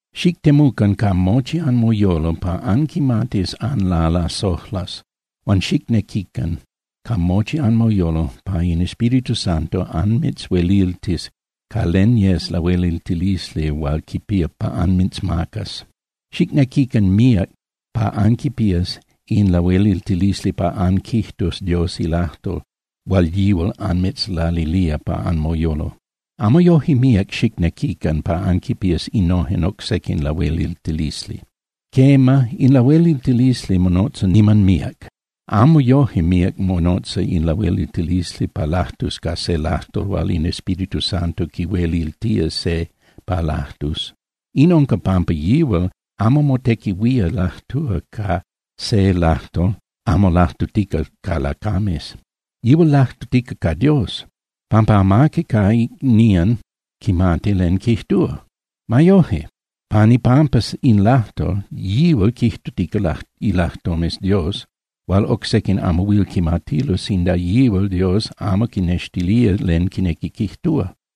Xictemucan ca mochi anmoyolo pa anquimatis anlalasojlas huan xicnequican ca mochi anmoyolo pa in Espíritu Santo anmitzhueliltis ca len yes lahueliltilisli hual quipía pa anmitzmacas. Xicnequican míac pa anquipías in lahueliltilisli pa anquijtus Dios ilajtol hual yihual anmitzlalilía pa anmoyolo. Amo yoje míac xicnequican pa anquipías innojen oc sequin lahueliltilisli. Quema, in lahueliltilisli monotza niman míac, amo yoje míac monotza in lahueliltilisli pa lajtus ca se lajtol hual in Espíritu Santo quihueliltía se pa lajtus. In unca pampa yihual hual motequihuía lajtúa ca se lajtol amo lajtutica ca lacames. Yihual lajtutica ca Dios, pampa amaqui ca icnían quimati len quijtúa. Ma yoje, pan ipampa in lajtol, yihual quijtutica ilajtomes Dios hual oc sequin amo huil quimatilo sinda yihual Dios amo quinnextilía len quinequi quijtúa.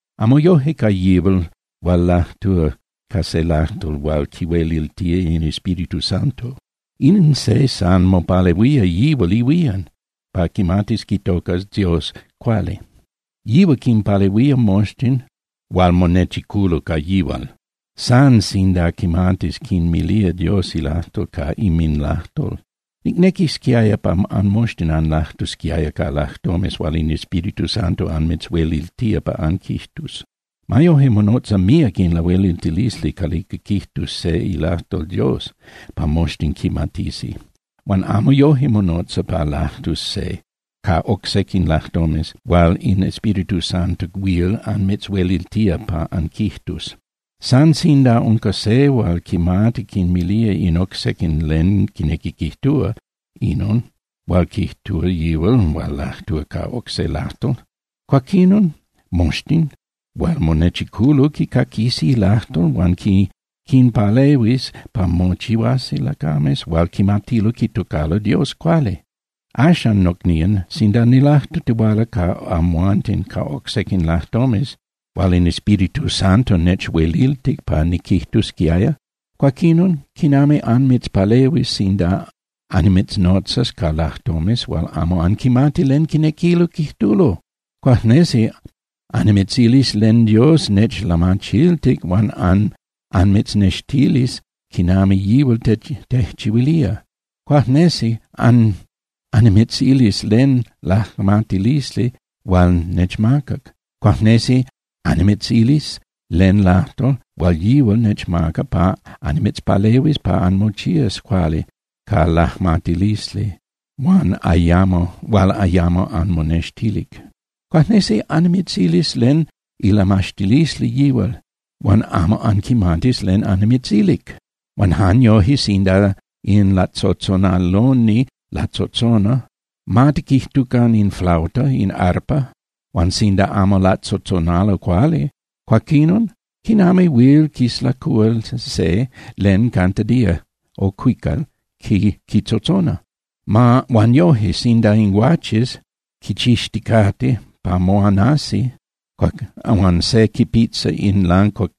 Amo yoje ca yihual hual lajtúa ca se lajtol hual quihueliltía in Espíritu Santo. In se san mopalehuía yihual ihuían pa quimatis quitocas Dios cuali. Yihual quinpalehuía moxtin hual monechiculo ca yihual, san sinda quimati quinmilía Dios ilajtol ca inminlajtol. Nicnequisquiaya pa anmoxtin anlajtusquiaya ca lajtomes hual in Espíritu Santo anmitzhueliltía pa anquijtus. Ma yoje, monotza míac in lahueliltilisli calica quijtus se ilajtol Dios pa moxtin quimatisi, huan amo yoje monotza pa lajtus se ca oc sequin lajtomes hual in Espíritu Santo huil anmitzhueliltía pa anquijtus. San sinda unca se hual quimati quinmilía in oc sequin len quinequi quijtúa inon hual quijtúa yihual hual lajtúa ca oc se lajtol, cuaquinon moxtin hual monechiculo quicaquisi lajtol hual quinpalehuis pa mochihuasi lacames hual quimatilo quitocalo Dios cuali. Axan, nocnían, sinda nilajtutihuala ca amhuanten ca oc sequin lajtomes hual in Espíritu Santo nechueliltic pa niquijtusquiaya, cuaquinon ¿quinami annimitzpalehuis sinda annimitznotzas ca lajtomes hual amo anquimati len quinequilo quijtulo? Cuajnesi annimitzilis len Dios nechlamachiltic hual anmitznextilis quinami yihual tejchihuilía. Cuajnesi annimitzilis len lajmatilisli hual nechmacac. Cuajnesi annimitzilis len lajtol hual yihual nechmaca pa annimitzpalehuis pa anmochías cuali ca lajmatilisli hual ayamo anmonextilic. Cuajnesi annimitzilis len ilamaxtilisli yihual, huan amo anquimatis len annimitzilic. Huan jan yoje sinda in latzotzonaloni latzotzona, ma tiquijtucan in flauta, in arpa, huan sinda amo latzotzonalo cuali, cuaquinon ¿quinami huil quislacúa se len cantadita (cuical) quitzotzona? Huan noje, sinda in guaches quichixticate pa moanasi huan se quipitza in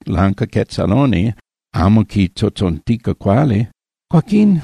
lancaquetzaloni amo quitzotzontica cuali, cuaquín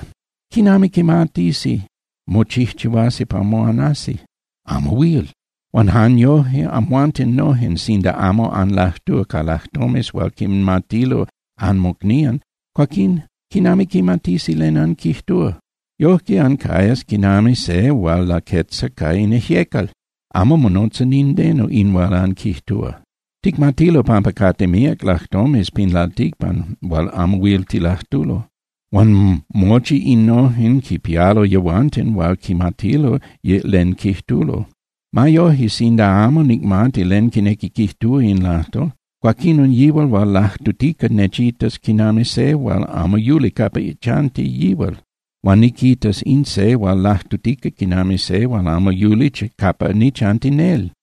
¿quinami quimatisi mochijchihuasi pa moanasi? Amo huil. Huan jan yoje amhuanten nojen, sinda amo anlajtúa ca lajtomes hual quinmatilo anmocnían, cuaquín ¿quinami quimatisi len anquijtúa? Yojque ancayas quinami se hual laquetza ca in ijyecal, amo monotza nindeno in hual anquijtúa. Ticmatilo pampa cate míac lajtomes pin lalticpan hual amo huil tilajtulo, huan mochi innojen quipialo yehuanten hual quimatilo len quijtulo. Ma yoje, sinda amo nicmati len quinequi quijtúa in lajtol, cuaquinon yihual hual lajtutica nechitas quinami se hual amo yuli capa chanti yihual, huan niquitas in se hual lajtutica quinami se hual amo yuli capa nichanti nel.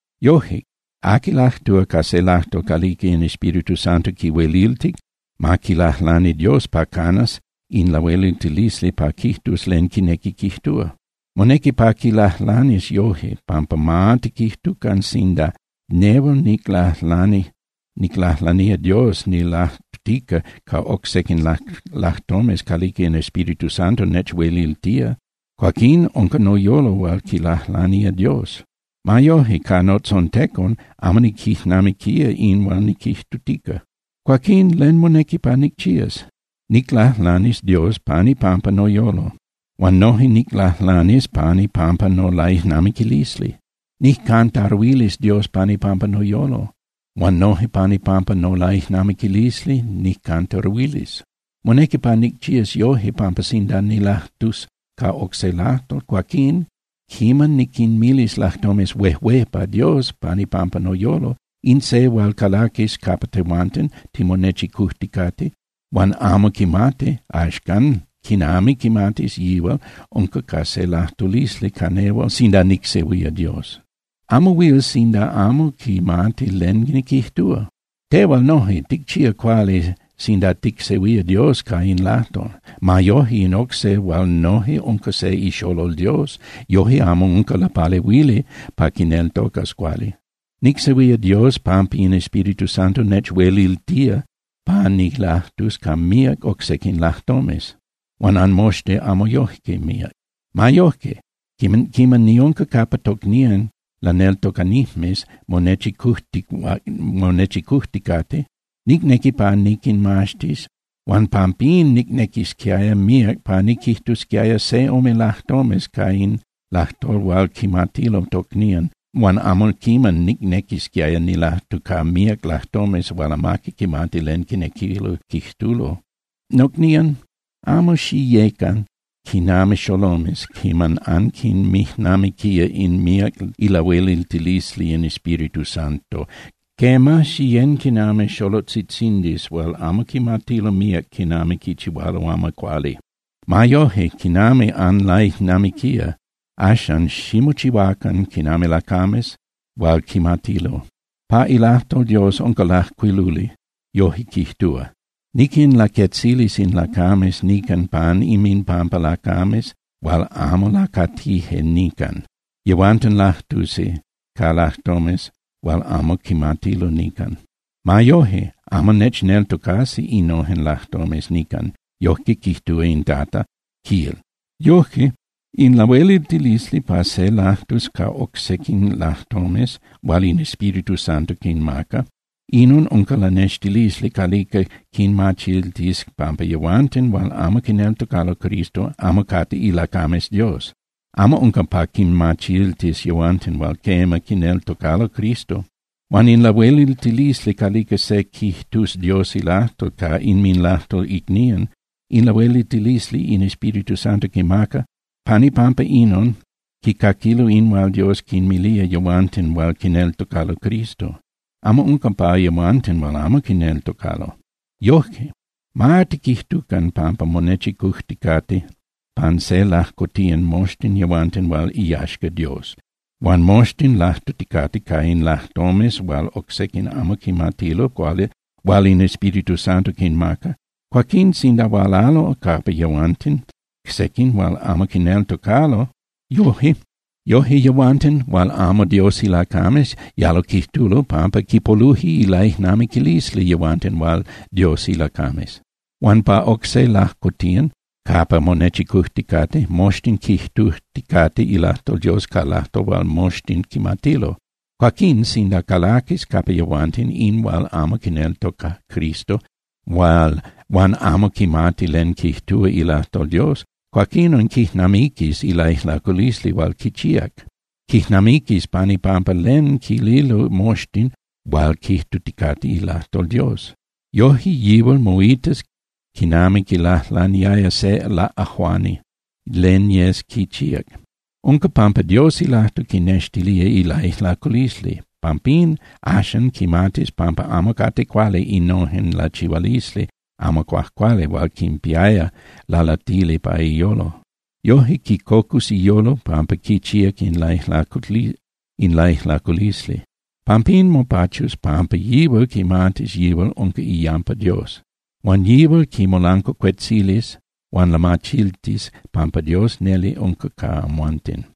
Yoje, aqui lajtúa ca se lajtol calica in Espíritu Santo quihueliltic, ma quilajlani Dios pa canas in lahueliltilisli pa quijtus len quinequi quijtúa. Monequi pa quilajlanis yoje, pampa ma tiquijtucan sinda nehual niclajlanía Dios nilajtutica ca oc sequin lajtomes calica in Espíritu Santo nechueliltía, cuaquín unca noyolo hual quilajlanía Dios. Ma yoje, ca notzontecon amo niquijnamiquía in hual niquijtutica. Cuaquín, ¿len monequi pa nicchías? Niclajlanis Dios pan ipampa noyolo, huan noje niclajlanis pan ipampa nolaijnamiquilisli. Nijcantaruilis Dios pan ipampa noyolo, huan noje pan ipampa nolaijnamiquilisli nijcantaruilis. Monequi pa nicchías yoje, pampa sinda nilajtus ca oc se lajtol, cuaquín quiman niquinmilis lajtomes huejué pa Dios pan ipampa noyolo, in se hual calaquis capa tehuanten timonechicujticate huan amo quimati, axcan ¿quinami quimatis yihual unca ca se lajtulisli ca nehual sinda nicsehuía Dios? Amo huil sinda amo quimati len niquijtúa. Tehual noje, ticchía cuali sinda ticsehuía Dios ca in lajtol. Ma yoje, in oc se hual noje unca se ixolol Dios yoje amo unca lapalehuili pa quineltocas cuali. Nicsehuía Dios pampa in Espíritu Santo nechueliltía pa nilajtus ca míac oc sequin lajtomes, huan anmoxtin amo yoje míac. Ma yoje, quiman niunca capa tocnían laneltocanijmes monechicujticate, nicnequi pa niquinmaxtis, huan pampín nicnequisquiaya míac pa niquijtusquiaya se ome lajtomes ca in lajtol hual quimatilo tocnían huan amo quiman nicnequisquiaya nilajtu ca míac lajtomes hual amaqui quimati len quinequilo quijtulo. Nocnían, amo xiyén (xiyecan) quinami xolomes quiman anquinmijnamiquía in míac ilahueliltilisli in Espíritu Santo. Quema, xiyén quinami xolotzitzindis hual amo quimatilo míac quinami quichihualo amo cuali. Ma yoje, quinami anlaijnamiquía, axan ximochihuacan quinami lacames hual quimatilo. Pa ilajtol Dios unca lajcuiluli, yoje quijtúa: “Niquinlaquetzilis in lacames nican pan inminpampa lacames hual amo lacatije nican. Yehuanten lajtusi ca lajtomes hual amo quimatilo nican. Ma yoje, amo nechneltocasi innojen lacames nican, yojque quijtúa in Tata”, quil. Yoje, in lahueliltilisli pa se lajtus ca oc sequin lajtomes hual in Espíritu Santo quinmaca, inon unca lanextilisli calica quinmachiltis pampa yehuanten hual amo quineltocalo Cristo amo cate ilacames Dios, amo unca pa quinmachiltis yehuanten hual quema, quineltocalo Cristo. Huan in lahueliltilisli calica se quijtus Dios ilajtol ca inminlajtol icnían, in lahueliltilisli in Espíritu Santo quimaca. Pan ipampa inon quicaquilo in hual Dios quinmilía yehuanten hual quineltocalo Cristo. Amo unca pa yehuanten hual amo quineltocalo. Yoje, ma tiquijtucan pampa monechicujticate pan se lajcotiyan moxtin yehuanten hual iyaxca Dios, huan moxtin lajtuticate ca in lajtomes hual oc sequin amo quimatilo, hual in Espíritu Santo quinmaca. Cuaquín sinda hualalo capa yehuanten sequin hual amo quineltocalo, yoje yehuanten hual amo Dios ilacames yalo quijtulo pampa quipoluje ilaijnamiquilisli yehuanten hual Dios ilacames. Huan pa oc se lajcotiyan capa monechicujticate, moxtin quijtuticate ilajtol Dios ca lajtol hual moxtin quimatilo. Cuaquín sinda calaquis capa yehuanten se hual amo quineltoca Cristo huan amo quimati len quijtúa ilajtol Dios, cuaquinon quijnamiquis ilaijlaculisli hual quichíac. Quijnamiquis pan ipampa len quililo moxtin hual quijtuticate ilajtol Dios. Yoje yihual moitas quinami quilajlaniaya se laꞌajuani len yes quichíac. Unca pampa Dios ilajtol quinextilía ilaijlaculisli. Pampín, axan quimatis pampa amo cate cuali innojen lachihualisli amo cuajcuali hual quinpiaya lalatili pa iyolo. Yoje quicocus iyolo pampa quichíac in laijlaculisli. Pampín mopachus pampa yihual quimatis yihual unca iyampa Dios. Huan yihual quimolancuacuetzilis huan lamachiltis pampa Dios neli unca ca amhuanten.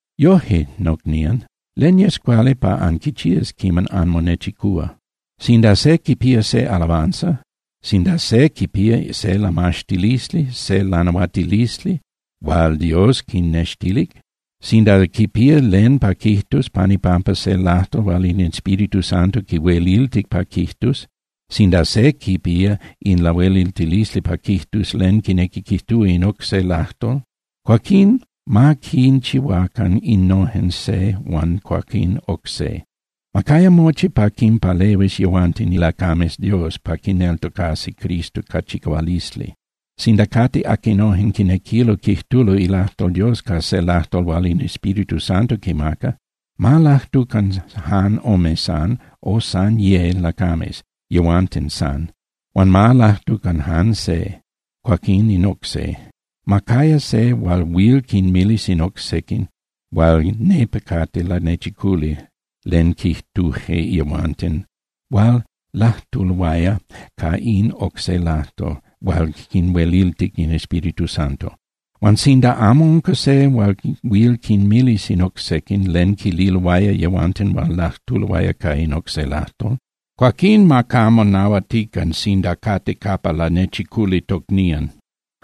Yoje, nocnían, ¿len yes cuali pa anquichías quiman anmonechicúa? Sinda se quipía se alabanza, sinda se quipía se lamaxtilisli, se lanahuatilisli hual Dios quinextilic, sinda quipía len pa quijtus pan ipampa se lajtol hual in Espíritu Santo quihueliltic pa quijtus, sinda se quipía in lahueliltilisli pa quijtus len quinequi quijtúa in oc se lajtol, cuaquín ma quinchihuacan innojen se huan cuaquín oc se. Ma caya mochi pa quinpalehuis yehuanten ilacames Dios pa quineltocasi Cristo ca chicahualisli. Sinda cate aquinojen quinequilo quijtulo ilajtol Dios ca se lajtol hual in Espíritu Santo quimaca, ma lajtucan jan ome san, o san ye lacames, yehuanten san. Huan ma lajtucan jan se, cuaquín in oc se. Ma caya se hual huil quinmilis in oc sequin hual nepa cate lanechiculi len quijtuje yehuanten hual lajtuloaya ca in oc se lajtol hual quinhueliltic in Espíritu Santo. Huan sinda amo unca se hual huil quinmilis in oc sequin len quililoaya yehuanten hual lajtuloaya ca in oc se lajtol, cuaquín ma camo nahuatican sinda cate capa lanechiculi tocnían,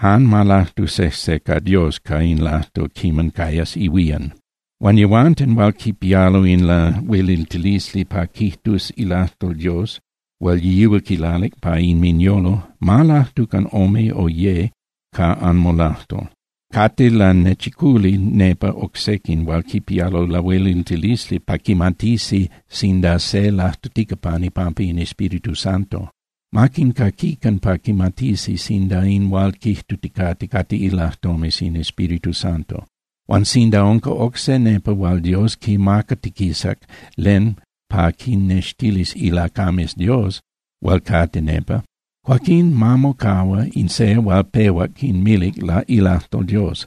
jan ma lajtu sejse ca Dios ca in lajtol quiman cayas ihuían. Huan yehuanten hual quipialo in lahueliltilisli pa quijtus ilajtol Dios hual yihual quilalic pa inminyolo, ma lajtucan ome o ye ca anmolajtol. Cate lanechiculi nepa oc sequin hual quipialo lahueliltilisli pa quimatisi sinda se lajtutica pan ipampa in Espíritu Santo. Ma quincaquican pa quimatisi sinda in hual quijtuticate cate ilajtomes in Espíritu Santo. Huan sinda unca oc se nepa hual Dios quimacatiquisac len pa quinnextilis ilacames Dios hual cate nepa, cuaquín ma mocahua in se hual pehuac quinmilic ilajtol Dios.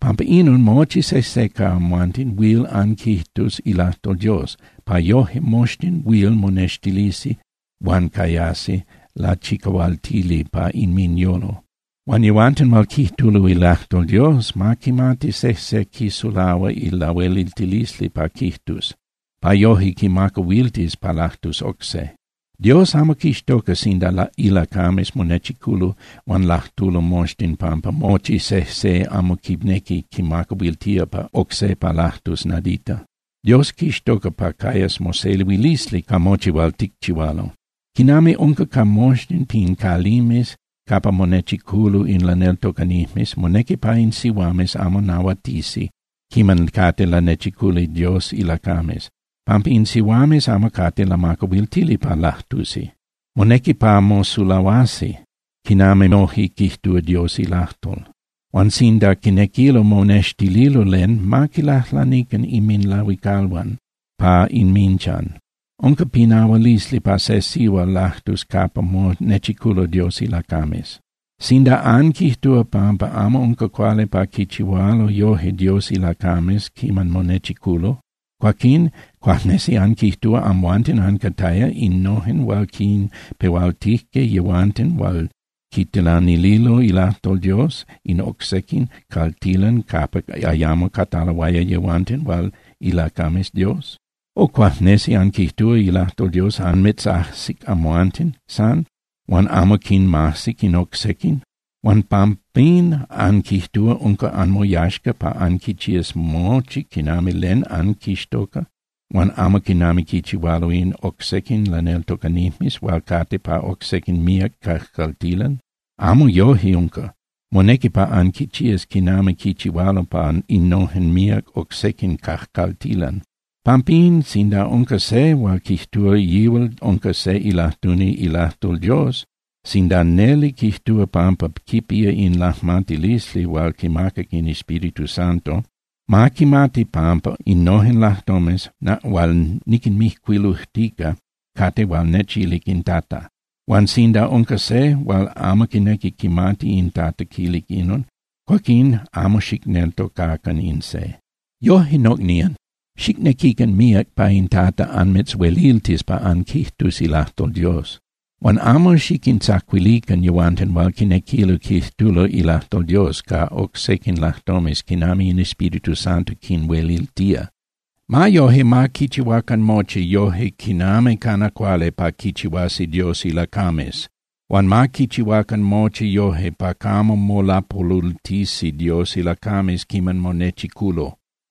Pampa inon mochi sejse ca amhuanten huil anquijtus ilajtol Dios, pa yoje moxtin huil monextilisi huan cayasi lachicahualtili pa inminyolo. Huan yehuanten hual quijtulo ilajtol Dios, ma quimati sejse quisulahua ilahueliltilisli pa quijtus, pa yoje quimacahuiltis pa lajtus oc se. Dios amo quixtoca sinda ilacames monechiculo huan lajtulo moxtin pampa mochi sejse amo quinequi quimacahuiltía oc se pa lajtus nadita. Dios quixtoca pa cayas mosehuilisli ca mochi hual ticchihualo. Quinami unca ca moxtin pin calimes capa monechiculo in laneltocanijmes, monequi pa in sihuames amo nahuatisi quiman cate lanechiculi Dios ilacames, pampa in sihuames amo cate lamacahuiltili pa lajtusi. Monequi pa mosulahuasi, quinami noje quijtúa Dios ilajtol. Huan sinda quinequilo monextililo len, ma quilajlanican inminlahuicalhuan pa inminchan. Unca pinahualisli pa se sihual lajtus capa monechiculo Dios ilacames. Sinda anquijtúa pampa amo unca cuali pa quichihualo yoje Dios ilacames quiman monechiculo, cuaquín ¿cuajnesi anquijtúa amhuanten ancataya innojen hual quinpehualtije yehuanten hual quitilanililo ilajtol Dios in oc sequin caltilan capa ayamo cataloaya yehuanten hual ilacames Dios? O ¿cuajnesi anquijtúa ilajtol Dios anmitzajsic amhuanten san, huan amo quinmajsic in oc sequin? Huan pampín ¿anquijtúa unca anmoyaxca pa anquichías mochi quinami yes anquixtoca, huan amo quinami quichihualo in oc sequin laneltocanijmes hual cate pa oc sequin míac cajcaltilan? Amo yoje unca. Monequi pa anquichías quinami quichihualo pa innojen míac oc sequin cajcaltilan. Pampín, sinda unca se hual quijtúa yihual unca se ilajtuni ilajtol Dios, sinda neli quijtúa pampa quipía in lajmatilisli hual quimacac in Espíritu Santo, ma quimati pampa innojen lajtomes hual niquinmijcuilujtica cate hual nechilic in Tata. Huan sinda unca se hual amo quinequi quimati in Tata quilic inon, cuaquín amo xicneltocacan in se. Yoje, nocnían, xicnequican míac pa in Tata anmitzhueliltis pa anquijtus ilajtol Dios, huan amo xiquintzacuilican yehuanten hual quinequilo quijtulo ilajtol Dios ca oc sequin lajtomes quinami in Espíritu Santo quinhueliltía. Ma yoje, ma quichihuacan mochi yoje quinami cana cuali pa quichihuasi Dios ilacames. Huan ma quichihuacan mochi yoje pa camo molapolultisi Dios ilacames quiman monechiculo.